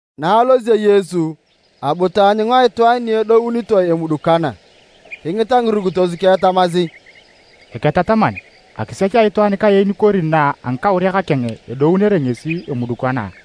Na alosio Yesu, abu taanyunga itwaan ni edounitoe emudukana. Kingita ngirukitos keng tamasi, “Eketataman, akisech a itwaan kaen kori na a ngikauriak keng edounere ngesi emudukana?”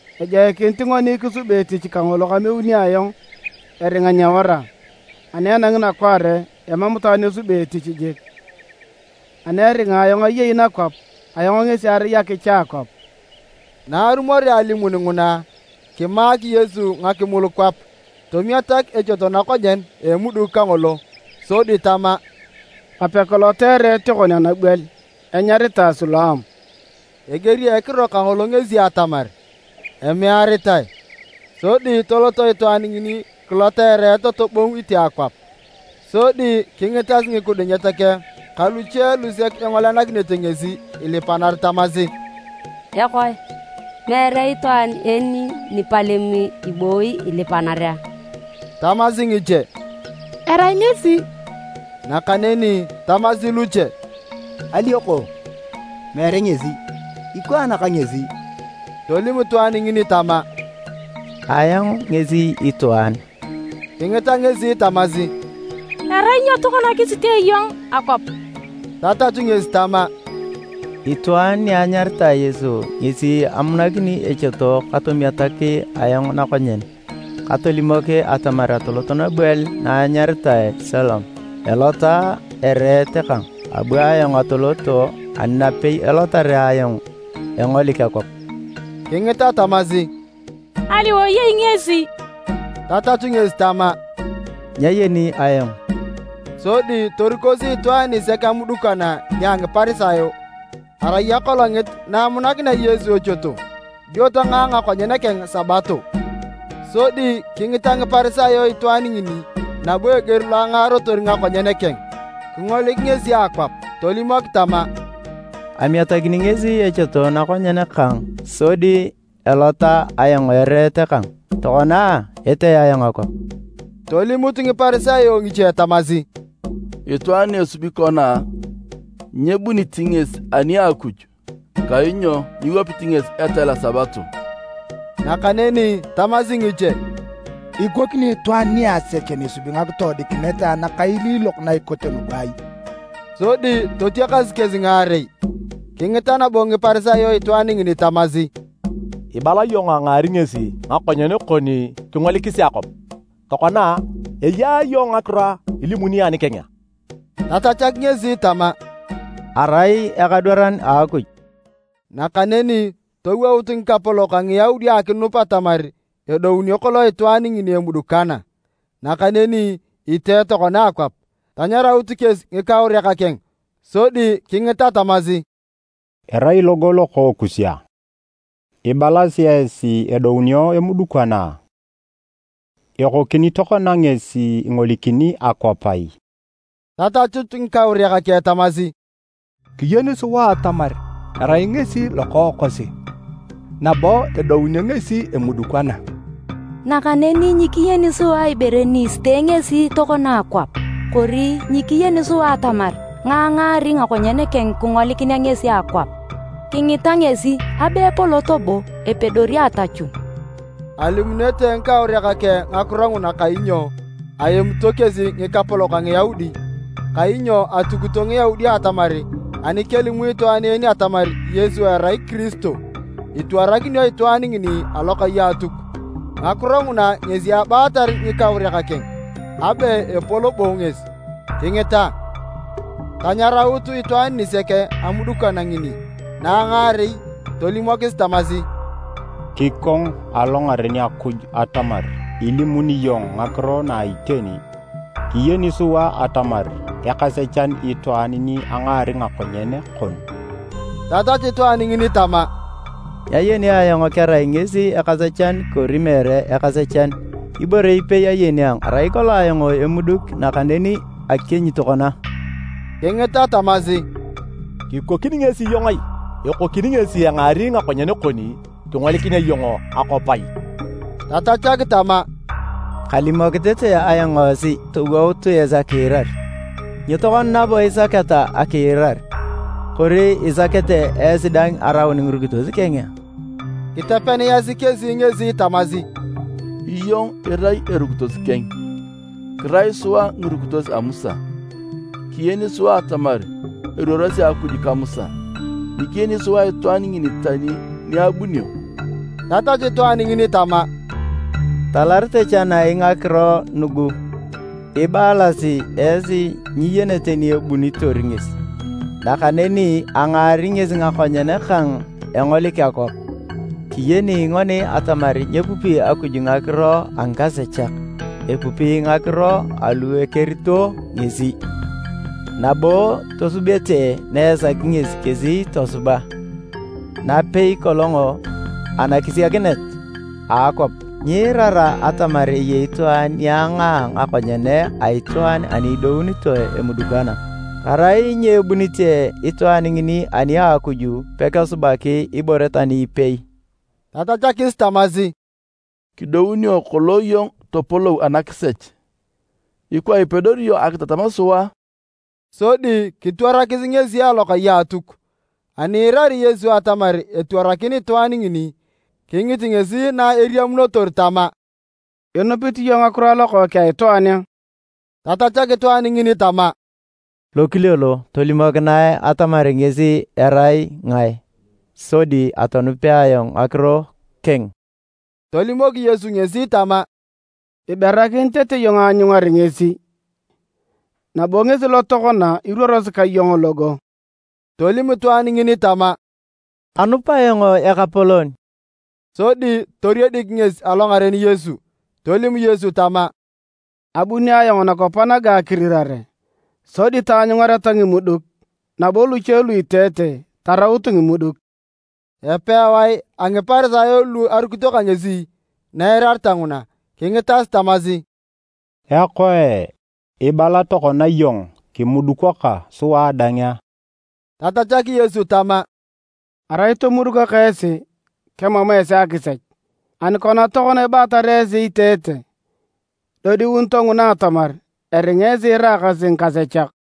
Ejoikinit ngoni kisubi etich kangolo kameuni ayong eringa nyewara, ani enangi nakwaare emam itwaan esubi etich jik. Ani aringa ayong ayei nakwap, ayong ngesi arai akicha a akwap.” Na arumorea alimun nguna, kimaak Yesu ngakimul kwap, tomunak echoto ka ngakimul, tomiatak echoto nakonyen a emuduk kangolo sodi tama, “Kape kilota ereet kon anabwel enyaritae Siloam,” (eger a ekiro kangolo ngesi atamar, “Emearitae.”) Sodi tolot itwaan ngini kilota ereet tobongu itee akwap. Sodi kingitas ngikidunyet keng ka luche lusek engolenakinete ngesi ilipanar tamasi, “Ekoe! Meere itwaan en nipalem ibooyi ilipanar a?” Tamasi ngiche “Erai ngesi,” nakaneni tamasi luche, “Alioko, meere ngesi, ikwaan ka ngesi.” Tolim itwaan ngini tama, “Ayong ngesi itwaan.” Kingita ngesi tamasi, “Erai nyo tokona kisitee iyong akwap?” Tatachu ngesi tama, “Itwaan ni enyaritae Yesu ngesi amunakini echoto katomiatak ayong nakonyen, katolimok atamar atolot nabwel na enyaritae Siloam elota ereet kang. Abu ayong atolot, ani napei elotarea ayong, engolik akwap.” Kingita tamasi, “Aliwae eyei ngesi?” Tatachu ngesi tama, “Nyayeni ayong.” Sodi torikosi itwaan nisek amudukana nia Ngiparisayo. Arai akolongit na amunakinea Yesu echoto dio tangaa ngakonyen keng Sabato. Sodi kingita Ngiparisayo itwaan ngini nabo eger lo angarotor ngakonyen keng kingolik ngesi akwap. Tolimok tama, “Amiatakini ngesi echoto nakonyen kang, sodi elota ayong ereet kang, tokona etee ayong akwap.” Tolimut Ngiparisayo ngiche tamasi, “Itwaan ni esubi kona nyebunit ngesi ani a Akuj, kainyo nyiwapit ngesi etal a Sabato.” Nakaneni tamasi ngiche, “Ikokini itwaan niasechan esubi ngakitoodikinet nakailiilok na ikote nugu ai?” Sodi totiakas kesi ngaarei. Kingita nabo Ngiparisayo itwaan ngini tamasi, “Ibala iyong angaari ngesi ngakonyen kon kingolikis akwap. Tokona a, eya iyong ngakiro ilimuni anikeng a?” Tatachak ngesi tama, “Erai ekadwaran a Akuj.” Nakaneni towout ngikapolok a Ngiyaudi akinup atamar edounio kolong itwaan ngini emudukana, nakaneni itee tokona akwap. Tanyaraut kesi ngikauriak keng sodi kingita tamasi, “Erai logo lokookus a? Ibalasi esi edounio emudukana. Ekokini tokona ngesi ingolikini akwap ai?” Tatachut ngikauriak keng tamasi, “Kiyeni sua atamar erai ngesi lokookosi, nabo edounio ngesi emudukana. Nakaneni nyikiyeni sua ibore ni isitee ngesi tokona akwap, kori nyikiyeni sua atamar ngae angaari ngakonyen keng kingolikinea ngesi akwap. Kingita ngesi, abe epolot bo epedori atachun!” Alimunete ngikauriak keng ngakiro nguna kainyo aemito kesi ngikapolok a Ngiyaudi, kainyo atukito Ngiyaudi atamar anikelimu itwaan atamar Yesu erai Kiristo, itwarakinio itwaan ngini alokai a Atuk. Ngakiro nguna ngesi abaatar ngikauriak keng, “Abe epol bo ngesi, kingita!” Tanyaraut itwaan nisek amudukana ngini na a ngaarei tolimokis tamasi, “Kikong alongaren Akuj atamar ilimuni iyong ngakiro na iteni! Kiyeni sua atamar ekasechan itwaan ni angaari ngakonyen kon.” Tatachu itwaan ngini tama, “Nyayeni ayong kerai ngesi ekasechan kori meere ekasechan. Ibore ipei ayeni, arai ayong emuduk, nakaneni akienyi tokona.” Kingita tamasi, “Kikokini ngesi iyong ai? Ekokini ngesi engaari ngakonyen kon kingolikinea iyong akwap ai?” Tatachak tama, “Kalimok tete ayong esi, towout esi akiirar. Nyo tokona nabo isaketa akiirar? Kori isakete esi dang araun ngirukitos keng?” Kitepeniyasi kesi ngesi tamasi, “Iyong irai erukitos keng, kirai sua ngirukitos a Musa. Kiyeni sua atamar eruorosi Akuj ka Musa, nyikiyeni sua itwaan ngini tani ni abunio!” Tatachu itwaan ngini tama, “Kitalarete chanai ngakiro nugu! Ibalasi esi nyiyenete ni ebunitor ngesi, nakaneni angaari ngesi ngakonyen kang engolik akwap! Kiyeni ngoni atamar nyepupi Akuj ngakiro a ngikasechak, epupi ngakiro alu ekerito ngesi, nabo tosubete na esaki ngesi kesi tosuba. Napei kolong anakisiakinet a akwap, nyiirara atamar eyei itwaan ni angaa ngakonyen a itwaan ani edounitoe emudukana. Arai nyebunite itwaan ngini ani a Akuj, pekesubaki ibore tani ipei.” Tatachakis tamasi, “Kidounio kolong iyong topolou anakisech, ikwa ipedori iyong akitatam sua a?” Sodi kitwarakis ngesi alokai a Atuk. Ani iirari Yesu atamar etwarakin itwaan ngini, kingit ngesi na eriamunotor tama, “Inupit iyong ngakiro a Lokookeng a Itwaan a?” Tatachak itwaan ngini tama, “Lokile lo, tolimokinae atamar ngesi erai ngae sodi atonupea ayong ngakiro keng!” Tolimok Yesu ngesi tama, “Iberakin tete iyong aanyungar ngesi, nabo ngesi lo tokona iruorosi ka iyong logo.” Tolim itwaan ngini tama, “Anup ayong Ekapolon!” Sodi toriedik ngesi alongaren Yesu. Tolim Yesu tama, “Abuni ayong nakwap naga akirirare, sodi taanyungareta ngimuduk, nabo luche lu iteete taraut ngimuduk.” Epewae a Ngiparisayo lu arukito ka ngesi na eirareta nguna, kingitas tamasi, “Ekoe, ibala tokona iyong kimudukaka sua dang a?” Tatachak Yesu tama, “Arai tomudukaka esi, kemam esi akisech. Ani kona tokona ibaatar esi iteete, idodiunito nguna atamar, eringa esi iraakasi ngikasechak.”